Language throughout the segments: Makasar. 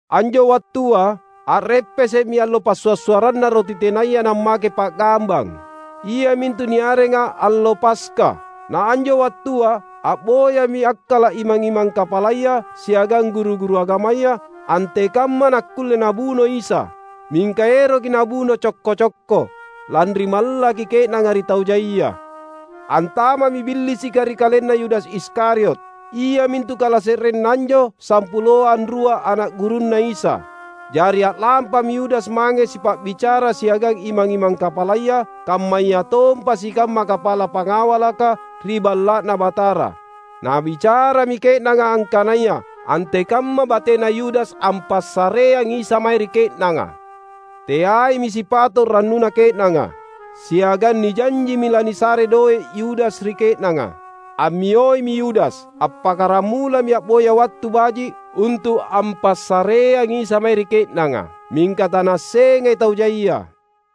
Anjo wattua a’reppese’mi allo Passua’-suarranna Roti Tenaya Nammake Pa’gambang, iamintu niarenga allo Paska. Na anjo wattua a’boyami akkala’ imang-imang kapalaya siagang guru-guru agamaya, antekamma nakkulle nabuno Isa. Mingka eroki nabuno cokko-cokko, lanri mallaki ke’nanga ri tau jaia. Antama’mi Billisika ri kalenna Yudas Iskariot, iamintu kalase’renna anjo sampuloa anrua ana’ gurunNa Isa. Jari a’lampami Yudas mange sipa’bicara siagang imang-imang kapalaya kammayatompa sikamma kapala pangawalaka ri Balla’Na Batara. Nabicarami ke’nanga angkanaya antekamma batena Yudas ampassareangi Isa mae ri ke’nanga. Teaimi sipato’ rannuna ke’nanga, siagang nijanjimi lanisare doe’ Yudas ri ke’nanga. Ammiomi Yudas. Appakkaramulami a’boya wattu baji’ untu’ ampassareangi Isa mae ri ke’nanga, mingka tanaassengai tau jaia.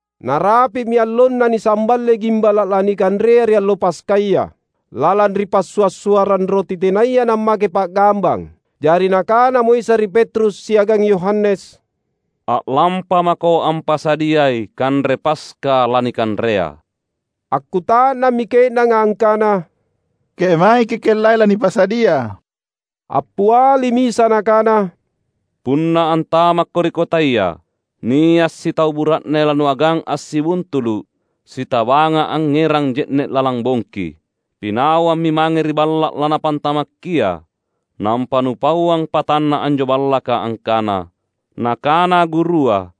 Narapi’mi allonna nisamballe gimbala’ lanikanrea ri allo Paskaya, lalang ri Passua’-suarrang Roti Tenaya Nammake Pa’gambang. Jari Nakanamo Isa ri Petrus siagang Yohanes, "A’lampa mako ampasadiai kanre Paska lanikanrea." Akkuta’nammi ke’nanga angkana, "Kemae Kikellai lanipasadia?" Appialimi Isa Nakana, "Punna antamakko ri kotaya, nia’ sitau bura’ne lanuagang assibuntulu’, sitabanga angngerang je’ne’ lalang bongki. Pinawammi mange ri balla’ lanapantamakkia. Nampa nupauang patanna anjo ballaka angkana: Nakana Gurua,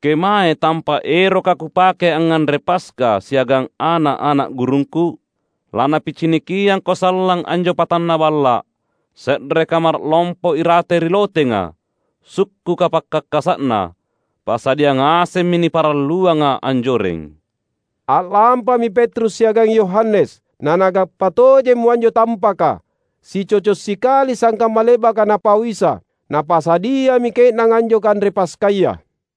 ‘Kemae tampa’ eroka Kupake angnganre Paska siagang ana’-ana’ gurungKu?’ Lanapicinikiangko sallang anjo patanna balla’, se’re kamara’ lompo irate ri lotenga, sukkuka pakkakasa’na. Pasadia ngasemmi niparalluanga anjoreng." A’lampami Petrus siagang Yohanes, nanagappa tojemmo anjo tampaka, sicoco’ sikali sangkamma le’baka Napau Isa. Napasadiami ke’nanga anjo kanre Paskaya.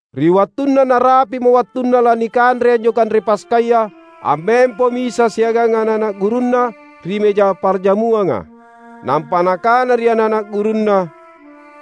Ri wattunna narapi’mo wattunna lanikanre anjo kanre Paskaya, ammempomi Isa siagang ana’-ana’ gurunNa ri mejang parjamuanga. Nampa Nakana ri ana’-ana’ gurunNa,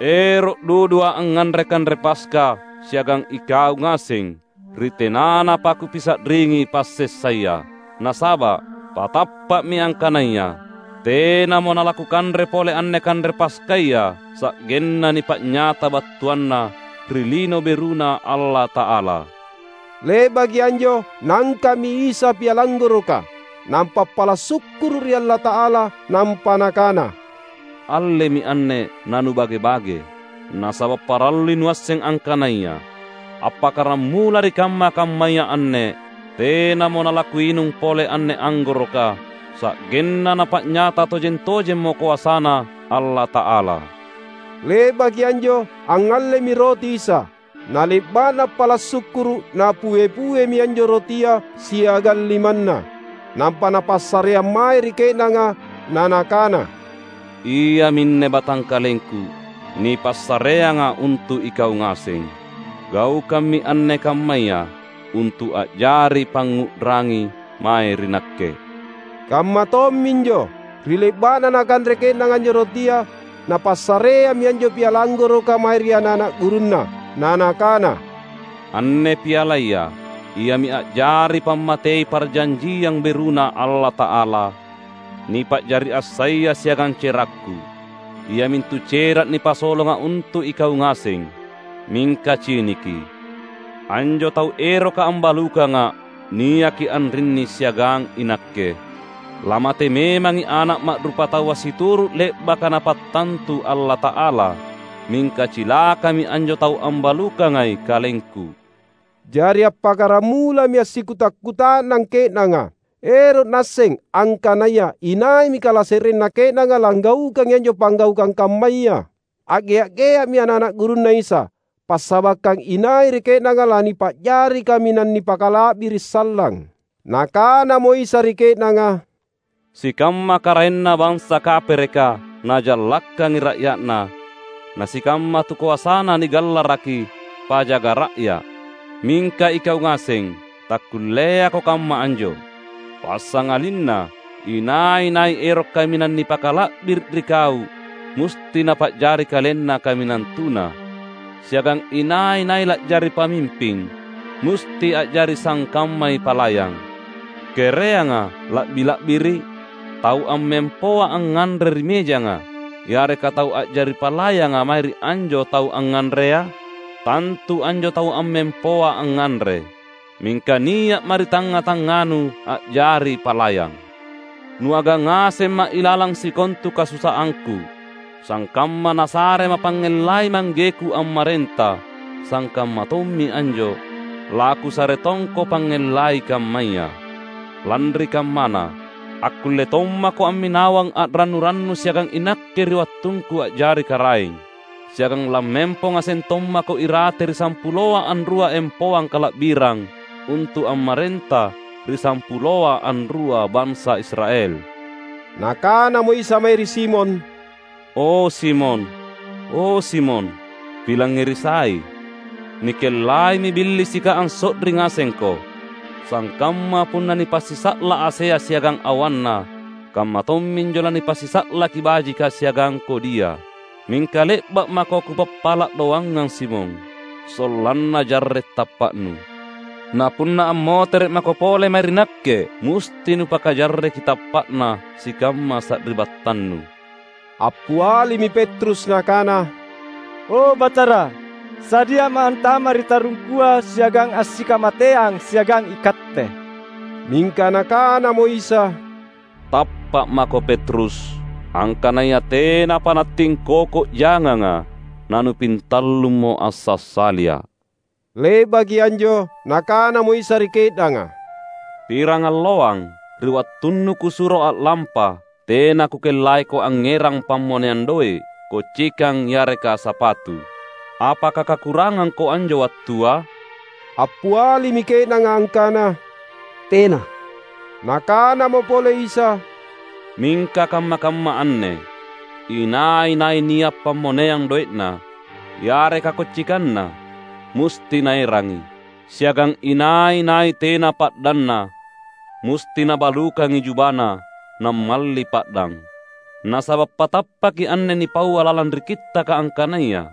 "Ero’ duduA’ angnganre kanre Paska siagang ikau ngaseng ri tenanapa Kupisa’ringi passessaya! Nasaba’, patappa’mi angkanaya: Tenamo nalaKukanre pole anne kanre Paskaya sa’genna nipa’nyata battuanna ri Lino Beruna Allata’ala." Le’baki anjo Naangka’mi Isa piala anggoroka, nampa appala’ sukkuru’ ri Allata’ala. Nampa Nakana, "Allemi anne, nanubage-bage; nasaba’ parallui nuasseng angkanaya: appakkaramula ri kamma-kammaya anne, tenamo nalaKuinung pole anne anggoroka, sa’genna Napa’nyata tojeng-tojemmo koasaNa Allata’ala." Le’baki anjo angngallemi roti Isa. Na le’ba’na appala’ sukkuru’, Napue-puemi anjo rotia siagang limanNa, nampa Napassareang mae ri ke’nanga, na Nakana, "Iaminne batangkalengKu [nipassareanga untu' ikau ngaseng. Gaukammi anne kammaya, untu' a'jari pangngu'rangi mae ri Nakke." Kamma tomminjo, ri le'ba'na nakanre ke'nanga anjo rotia, Napassareammi anjo piala anggoroka mae ri ana'-ana' gurunNa, na Nakana, "Anne pialaya iami a'jari pammatei parjanjiang beruNa Allata'ala, nipa'jari assaya siagang cerakKu, iamintu cera' nipasolonga untu' ikau ngaseng."] "Mingka ciniki! Anjo tau eroka ambalukangA’ niaki anrinni siagang iNakke! Lamate memangi Ana’ Ma’rupataua situru’ le’baka Napattantu Allata’ala; mingka cilakami anjo tau ambalukangai KalengKu!" Jari appakkaramulami assikuta’-kuta’nang ke’nanga, ero’ naasseng angkanaya inaimi kalase’renna ke’nanga langgaukangi anjo panggaukang kammaya. A’gea’-gea’mi ana’-ana’ gurunNa Isa, passabakkang inai ri ke’nanga lanipa’jari kaminang nipakala’biri’ sallang. Nakanamo Isa ri ke’nanga, "Sikamma karaenna bansa kapereka najallakkangi ra’ya’na, na sikamma tukoasana nigallaraki ‘Pajaga Ra’ya". Mingka ikau ngaseng, takkulleako kamma anjo. Passangalinna, inai-nai ero’ kaminang nipakala’biri’ ri kau musti napa’jari kalenna kaminang tuna. Siagang inai-nai la’jari pamimping, musti a’jari sangkammai palayang. Kereanga la’bi la’biri’?: tau ammempoa angnganre ri mejanga, yareka tau a’jari palayanga mae ri anjo tau angnganrea? Tantu anjo tau ammempoa angnganre. Mingka nia’Ma’ ri tangnga-tangnganu a’jari palayang. Nuagang ngasemMa’ ilalang sikontu kasusaangKu. Sangkamma nasareMa’ pangngellai ManggeKu ammarenta, sangkamma tommi anjo, laKusare tongko pangngellai kammaya. Lanri kammana, akkulle tommako amminawang a’rannu-rannu siagang iNakke ri wattungKu a’jari Karaeng. Siagang lammempo ngaseng tommako irate ri sampuloa anrua empoang kala’birang, untu’ ammarenta ri sampuloa anrua bansa Israel." Nakanamo Isa mae ri Simon, "O Simon, o Simon, pilangngeri sai! Nikellaimi Billisika anso’ri ngasengko. Sangkamma punna nipasisa’la’ asea siagang awanna, kamma tomminjo lanipasisa’laki bajika siagang kodia. Mingka le’ba’ mako Kupappala’ doangang Simon, sollanna jarre’ tappa’nu. Na punna ammotere’ mako pole mae ri Nakke, musti nupakajarreki tappa’na sikamma sari’battannu." Appialimi Petrus nakana, "O, Batara, sadiama’ antama’ ri tarungkua siagang assikamateang siagang iKatte!" Mingka Nakanamo Isa, "Tappa’ mako Petrus, angkanaya tenapa nattingkoko janganga, nanupintallummo ansassaliA’." Le’baki anjo Nakanamo Isa ri ke’nanga, "Pirangalloang, ri wattunnu Kusuro a’lampa, tena Kukellaiko angngerang pammoneang doe’, kocikang yareka sapatu. Apaka kakurangangko anjo wattua?" Appialimi ke’nanga angkana, "Tena!" Nakanamo pole Isa, "Mingka kamma-kamma anne, inai-nai nia’ pammoneang doe’na, yareka kocikanna, musti naerangi; siagang inai-nai tena pa’danna, musti nabalukangi jubana, nammalli pa’dang. Nasaba’ patappaki anne nipaua lalang ri Kittaka angkanaya,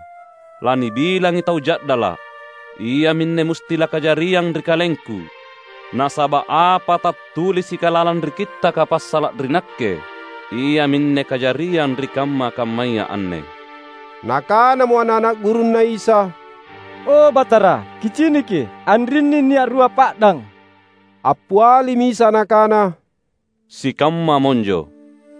‘Lanibilangi tau ja’dala’.’ Iaminne musti lakajariang ri KalengKu. Nasaba’ apa tattulisika lalang ri Kittaka passala’ ri Nakke, iaminne kajariang ri kamma-kammaya anne." Nakanamo ana’-ana’ gurunNa Isa, "O Batara, Kiciniki, anrinni nia’ rua pa’dang." Appialimi Isa Nakana, "Sikamma monjo."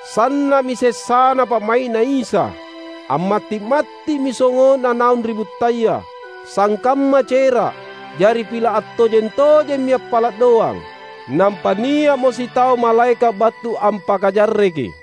[Sanna'mi sessana pa'mai'Na Isa. Ammatti'-matti'mi songo'Na naung ri buttaya, sangkamma cera'. Jari pila' attojeng-tojemmi appala' doang. Nampa nia'mo sitau malaeka' battu ampakajarreki.]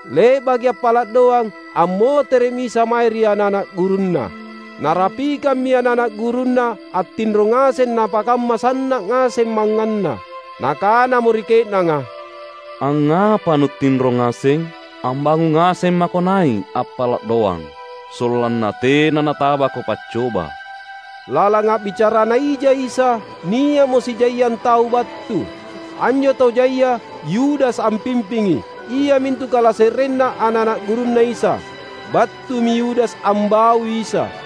Le’baki appala’ doang, ammotere’mi Isa mae ri ana’-ana’ gurunNa. Narapikammi ana’-ana’ gurunNa attinro ngaseng napakamma sanna’ ngaseng mangnganna. Nakanamo ri ke’nanga, "Angngapa nuttinro ngaseng? Ambangung ngaseng mako nai’ appala’ doang, sollanna tena natabako paccoba." Lalang a’bicarana ija Isa, nia’mo sijaiang tau battu. Anjo tau jaia Yudas ampimpingi, iamintu kalase’renna ana’-ana’ gurunNa Isa. Battumi Yudas ambaui Isa.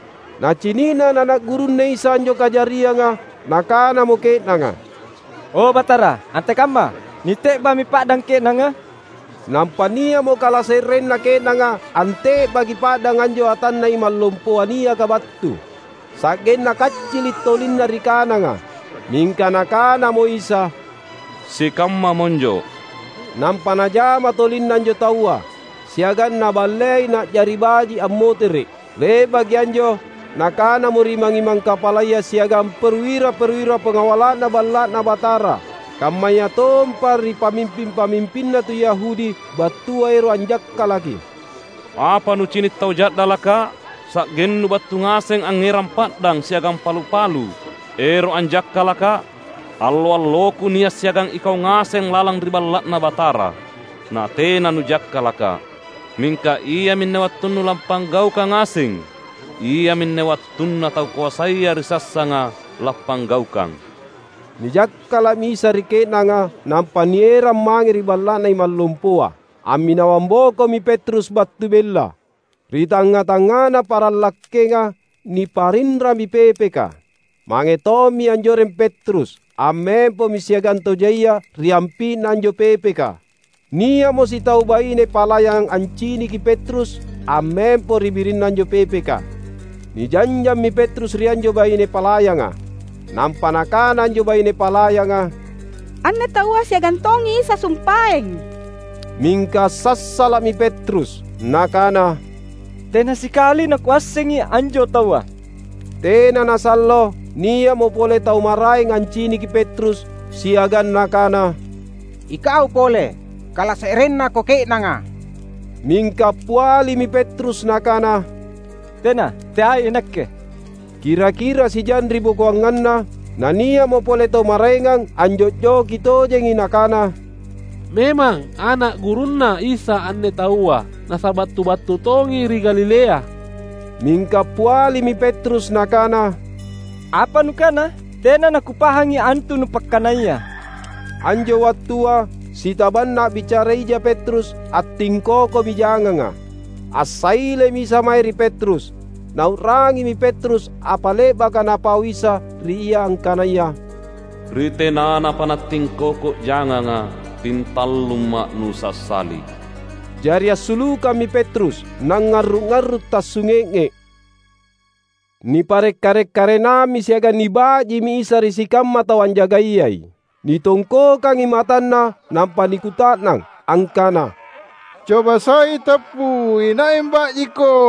Nacini’na ana’-ana’ gurunNa Isa anjo kajarianga, nakanamo ke’nanga, "O Batara, antekamma! Nite’ba’mi pa’dang ke’nanga?" Nampa nia’mo kalase’renna ke’nanga ante’baki pa’dang anjo atanna imang lompoa niaka battu, sa’genna kaccili’ tolinna ri kananga. Mingka Nakanamo Isa, "Sikamma monjo!" Nampa Najama tolinna anjo taua, siagang Naballei na’jari baji’ ammotere’. Le’baki anjo Nakanamo ri imang-imang kapalaya siagang perwira-perwira pangawala’na Balla’Na Batara, kammayatompa ri pamimping-pamimpinna tu Yahudi battua ero’ anjakkalaki, "Apa nucini’ tau ja’dalakKa’, sa’gennu battu ngaseng angngerang pa’dang siagang palu-palu ero’ anjakkalakKa’? Allo-alloKu nia’ siagang ikau ngaseng lalang ri Balla’Na Batara, natena nujakkalaKa’. Mingka iaminne wattunnu lappanggaukang ngaseng. Iaminne wattunna tau koasaya ri sassanga lappanggaukang." Nijakkala’mi Isa ri ke’nanga nampa nierang mange ri balla’na imang lompoa. Amminawang bokomi Petrus battu bella. Ri tangnga-tangngana paranglakkenga niparinrami pepeka. Mange tommi anjoreng Petrus; ammempomi siagang tau jaia ri ampi’na anjo pepeka. Nia’mo sitau baine palayang anciniki Petrus ammempo ri birinna anjo pepeka; nijanjammi Petrus ri anjo baine palayanga. Nampa nakana anjo baine palayanga, "Anne taua siagang tongi Isa sumpaeng!" Mingka assassala’mi Petrus. Nakana, "Tena sikali nakuassengi anjo taua!" Tena nasallo, nia’mo pole tau maraeng anciniki Petrus, siagang nakana, "Ikau pole, kalase’rennako ke’nanga!" Mingka appialimi Petrus nakana, "Tena, teai inakke!" Kira-kira sijang ribokoanganna, nia’mo pole tau maraengang anjo’joki tojengi nakana, "Memang! Ana’ gurunNa Isa anne taua, nasaba’ tu battu tongi ri Galilea!" Mingka appialimi Petrus nakana, "Apa nukana? Tena nakupahangi antu nupakkanaya!" Anjo wattua, sitabanna a’bicara ija Petrus, attingkokomi janganga. Assailemi Isa mae ri Petrus. Nau’rangimi Petrus apa le’baka Napau Isa ri ia angkanaya, "Ri tenanapa nattingkoko janganga, pintallumMa’ nusassali." Jari assulukammi Petrus, nangngarru’-arru’ tassunge’nge’. Nipare’ karek-karenammi siagang niba’jimi Isa ri sikamma tau anjagaiyai. Nitongkokangi matanNa, nampa nikuta’nang, angkana, "Coba sai tappu, inai amba’jiKo?"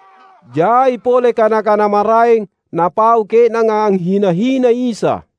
Jai pole kana-kana maraeng napau ke’nanga anghina-hinai Isa.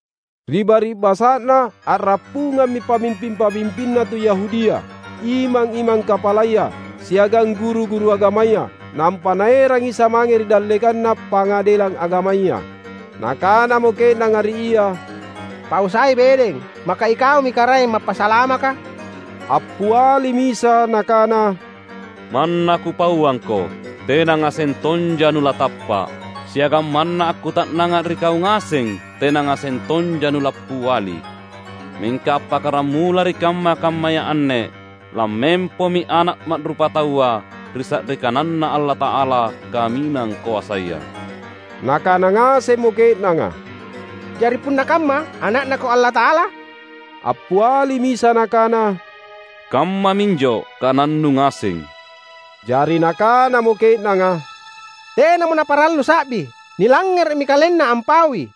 Ri bari’basa’na, a’rappungammi pamimping-pamimpinna tu Yahudia, imang-imang kapalaya, siagang guru-guru agamaya, nampa naerang Isa mange ri dallekanna Pangadelang Agamaya. Nakanamo ke’nanga ri Ia, "Pau sai bedeng, maka iKaumi Karaeng Mappasalamaka?" Appialimi Isa Nakana, "Manna Kupauangko tena ngaseng tonja nulatappa’. Siagang manna akkuta’nangA’ ri kau ngaseng tena ngaseng tonja nulappiali. Mingka appakkaramula ri kamma-kammaya anne lammempomi Ana’ Ma’rupataua ri sa’ri kananNa Allata’ala Kaminang Koasaya." Nakana ngasemmo ke’nanga, "Jari punna kamma Ana’NaKo Allata’ala?" Appialimi Isa Nakana, "Kammaminjo kanannu ngaseng." Jari nakanamo ke’nanga, "Tenamo naparallu sa’bi! Nilangngere’mi KalenNa ampaui!"